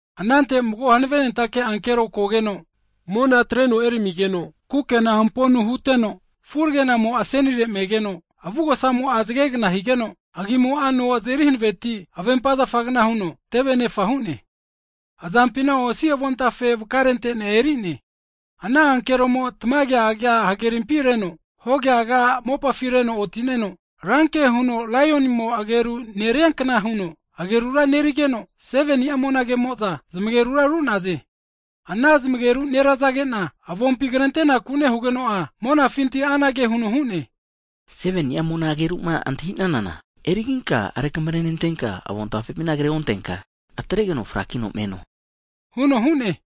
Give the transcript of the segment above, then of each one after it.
Anante mago hanavenentake ankero kogeno, mona atreno eramigeno kukena hamponu hunteno, furegenamo asenire me'geno, avugosamo'a zgegna higeno, agimo'a no azeri hanaveti avempa zafagna huno teve anefa hu'ne. Azampina osi avontafe vakarente'nea eri'ne. Ana ankeromo'a tamaga agia hagerimpi reno, hoga agia mopafi reno otineno, ranke huno laionimo ageru neriankna huno agerura nerigeno, 7ni'a monage'mo'za zmagerura ru'naze Ana zmagerura nerazagena, avompi krentenaku nehugeno'a, monafinti anage huno hu'ne, 7ni'a mona ageruma antahinana eriginka rekamrenentenka, avontafepina kreontenka atregeno frakino meno huno hu'ne.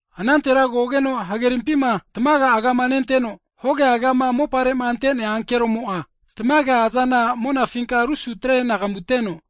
Anantera kogeno hagerimpima tamaga agama nenteno, hoga agama mopare'ma ante'nea ankeromo'a tamaga azana monafinka rusute'nagamu atreno,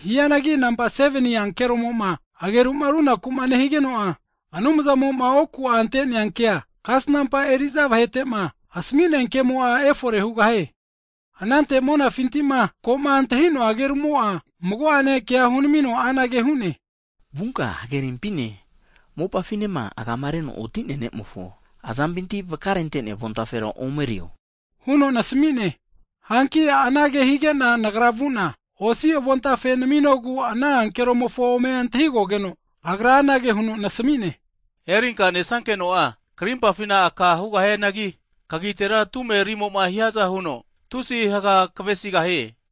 Hianagi nampa 7ni ankeromoma ageruma runakuma nehigeno'a, Anumzamo'ma oku'a ante'nea kea, kasnampa eriza vahetema asami'nea kemo'a efore hugahie. Anante monafintima koma antahinoa agerumo'a mago'ane kea hunamino anage hu'ne, vunka hagerimpine mopafinema agama reno oti'nea ankeromofo azampima vakarente'nea avontafera omerio huno nasmi'ne. Hanki anage higena nagra vuna, osi avontafe naminogu ana ankeromofo ome antahigogeno, agra anage huno nasamine, erinka nesankeno'a karimpafina aka hugahianagi, kagitera tumerimoma hiaza huno tusi haga kavesigahie.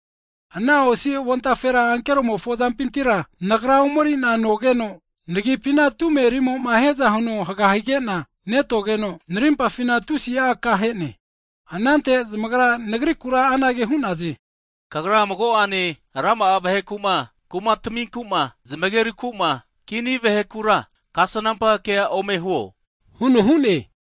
Ana osi avontafera ankeromofo azampintira nagra omerina nogeno, nagipina tume rimoma hiaza huno haga higena netogeno, narimpafina tusi aka ahe'ne. Anante zmagra nagrikura anage hu'naze, kagra mago'ane rama'a vaheku'ene kumataminku'ene, zmagerukuma, kini vahekura kasnampa kea ome huo hu'za hu'naze.